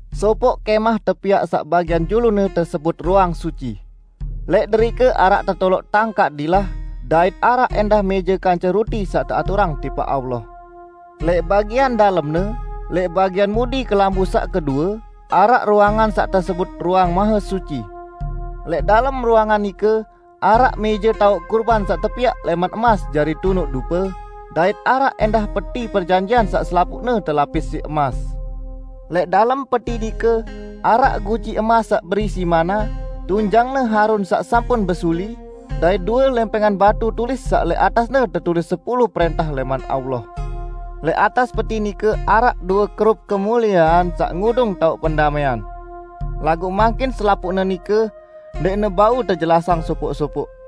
Sopoq kẽmah tepiaq saq bagian julune tesebut Ruang Suci. Lẽq derike araq tetoloq tangkaq dilah dait araq ẽndah mẽje kance ruti saq teaturang tipaq Allah. Lẽq bagian dalemne, lẽq bagian mudi kelambu saq kedue, araq ruangan saq tesebut Ruang Mahesuci. Lẽq dalem ruangan nike araq mẽje taoq kurban saq tepiaq lẽman emas jari tunuq dupe, dait araq ẽndah Peti Perjanjian saq selapuqne telapis siq emas. Lẽq dalem peti nike araq guci emas saq berisi manna, tunjangne Harun saq sampun besuli, dait due lẽmpẽngan batu tulis saq lẽq atasne tetulis sepulu prẽntah lẽman Allah. Lẽq atas Peti nike araq due Kerub kemuliean saq ngudung taoq pendamẽan. Laguq mangkin selapuqne nike ndẽqne bau tejelasang sopoq-sopoq.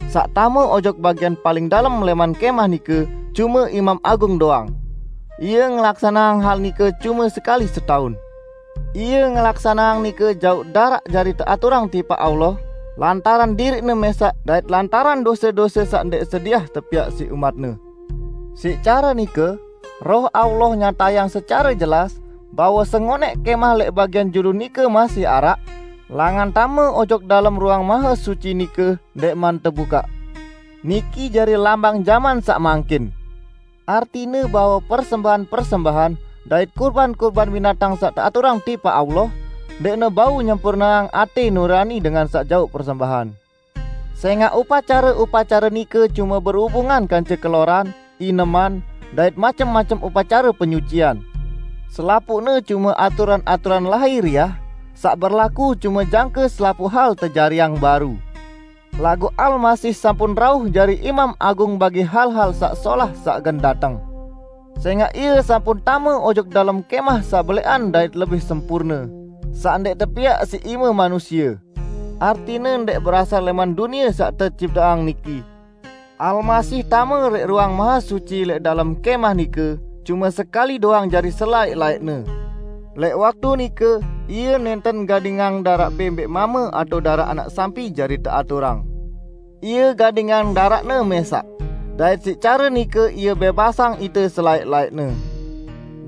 Saq tame ojok bagian paling dalem lẽman kẽmah nike cume imam agung doang. Ie ngelaksaneang hal nike cume sekali setaun. Ie ngelaksaneang nike jauq daraq jari teaturang tipaq Allah lantaran diriqne mẽsaq dait lantaran dose-dose saq ndẽq sediah tepiaq siq umat-Ne. Siq care nike, Roh Allah nyatayang secare jelas, bahwe sengonẽq kẽmah lẽq bagian julu nike masih araq, langan tame ojok dalem Ruang Mahesuci nike ndẽqman tebukaq. Niki jari lambang jaman saq mangkin; artine bahwe persembahan-persembahan dait kurban-kurban binatang saq teaturang tipaq Allah, ndẽqne bau nyempurneang atẽ nurani dengan saq jauq persembahan. Sẽngaq upacare-upacare nike cume berubungan kance keloran, ineman, dait macem-macem upacare penyucian. Selapuqne cume aturan-aturan lahiriah saq berlaku cume jangke selapuq hal tejariang baru. Laguq Almasih sampun rauh jari Imam Agung bagi hal-hal saq solah saq gen dateng, sẽngaq Ie sampun tame ojok dalem kẽmah saq belẽqan dait lebih sempurne, saq ndẽq tepiaq siq ime manusie, artine ndẽq berasal lẽman dunie saq tecipteang niki. Almasih tame lẽq Ruang Mahesuci lẽq dalem kẽmah nike cume sekali doang jari selaẽq-laẽqne. Lẽq waktu nike Ie nẽnten gadingang daraq bẽmbẽq mame atao daraq anak sampi jari teaturang; Ie gadingang daraqne mẽsaq, dait siq care nike Ie bẽbasang ite selaẽq-laẽqne.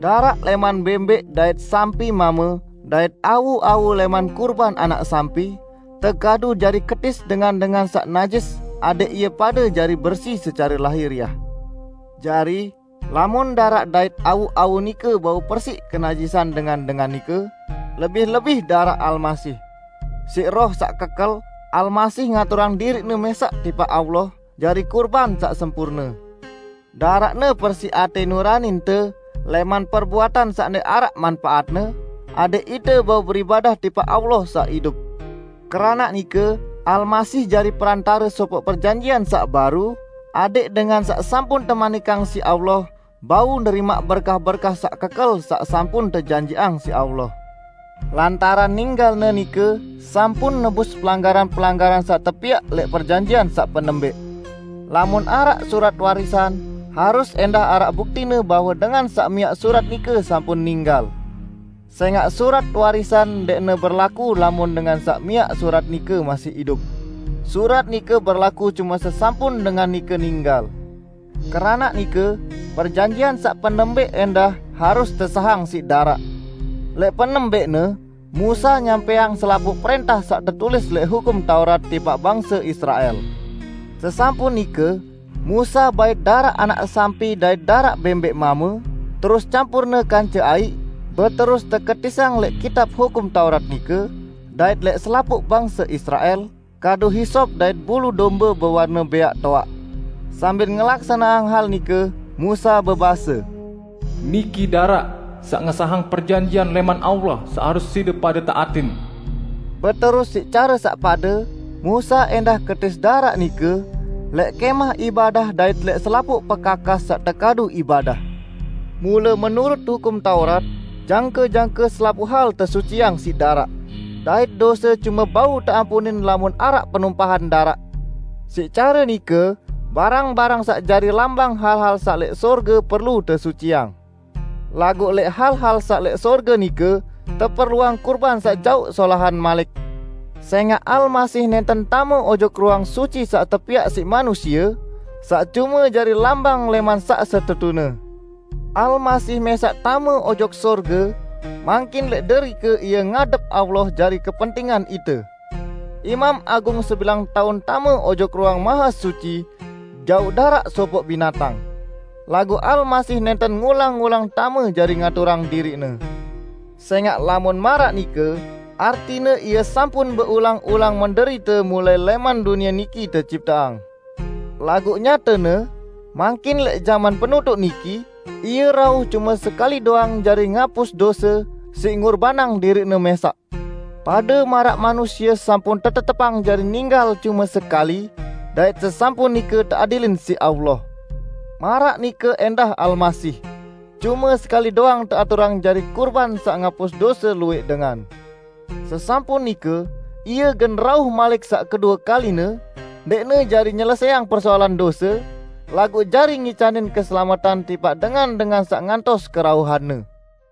Daraq lẽman bẽmbẽq dait sampi mame dait awu-awu lẽman kurban anak sampi, tekadu jari ketis dengan-dengan saq najis adẽq ie pade jari bersi secare lahiriah. Jari, lamun daraq dait awu-awu nike bau persiq kenajisan dengan-dengan nike, lebih-lebih daraq Almasih! Siq Roh saq kekel, Almasih ngaturang diriq-Ne mẽsaq tipaq Allah jari kurban saq sempurne. Daraq-Ne persiq atẽ nuraninte lẽman perbuatan saq ndẽq araq manpaatne, adẽq ite bau beribadah tipaq Allah saq idup. Keranaq nike Almasih jari Perantare sopoq perjanjian saq baru, adẽq dengan saq sampun temanikang siq Allah bau nerimaq berkah-berkah saq kekel saq sampun tejanjiqang siq Allah, lantaran ninggal-Ne nike sampun nebus pelanggaran-pelanggaran saq tepiaq lẽq perjanjian saq penembẽq. Lamun araq surat warisan, harus ẽndah araq buktine bahwe dengan saq miaq surat nike sampun ninggal. Sẽngaq surat warisan ndẽqne berlaku lamun dengan saq miaq surat nike masih idup. Surat nike berlaku cume sesampun dengan nike ninggal. Keranaq nike perjanjian saq penembẽq ẽndah harus tesahang siq daraq. Lẽq penembẽqne Musa nyampẽang selapuq prẽntah saq tetulis lẽq Hukum Taurat tipaq bangse Israel. Sesampun nike Musa bait daraq anak sampi dait daraq bẽmbẽq mame, terus campurne kance aiq, beterus teketisang lẽq Kitab Hukum Taurat nike dait lẽq selapuq bangse Israel kadu hisop dait bulu dombe bewarne bẽaq toaq. Sambil ngelaksaneang hal nike Musa bebase, "Niki daraq saq ngesahang perjanjian lẽman Allah saq harus side pade taatin." Beterus siq care saq pade, Musa ẽndah ketis daraq nike lẽq kẽmah ibadah dait lẽq selapuq pekakas saq tekadu ibadah. Mule menurut Hukum Taurat, jangke-jangke selapuq hal tesuciang siq daraq; dait dose cume bau teampunin lamun araq penumpahan daraq. Siq care nike barang-barang saq jari lambang hal-hal saq lẽq sorge perlu tesuciang. Laguq lẽq hal-hal saq lẽq sorge nike teperluang kurban saq jaoq solahan malik. Sẽngaq Almasih nẽnten tame ojok Ruang Suci saq tepiaq siq manusie, saq cume jari lambang lẽman saq setetune. Almasih mẽsaq tame ojok sorge; mangkin lẽq derike Ie ngadep Allah jari kepentingan ite. Imam Agung sebilang taun tame ojok Ruang Mahesuci jauq daraq sopoq binatang. Laguq Almasih nẽnten ngulang-ulang tame jari ngaturang diriq-Ne. Sẽngaq lamun maraq nike, artine Ie sampun beulang-ulang menderite mulai lẽman dunie niki tecipteang. Laguq nyatene, mangkin lẽq jaman penutuq niki, Ie rauh cume sekali doang jari ngapus dose siq ngurbanang diriq-Ne mẽsaq. Pade maraq manusie sampun tetetepang jari ninggal cume sekali dait sesampun nike teadilin siq Allah. Maraq nike ẽndah Almasih, cume sekali doang teaturang jari kurban saq ngapus dose luwẽq dengan. Sesampun nike Ie gen rauh malik saq kedue kaline, ndẽqne jari nyelesẽang persoalan dose, laguq jari ngicanin keselametan tipaq dengan-dengan saq ngantos kerauhan-Ne.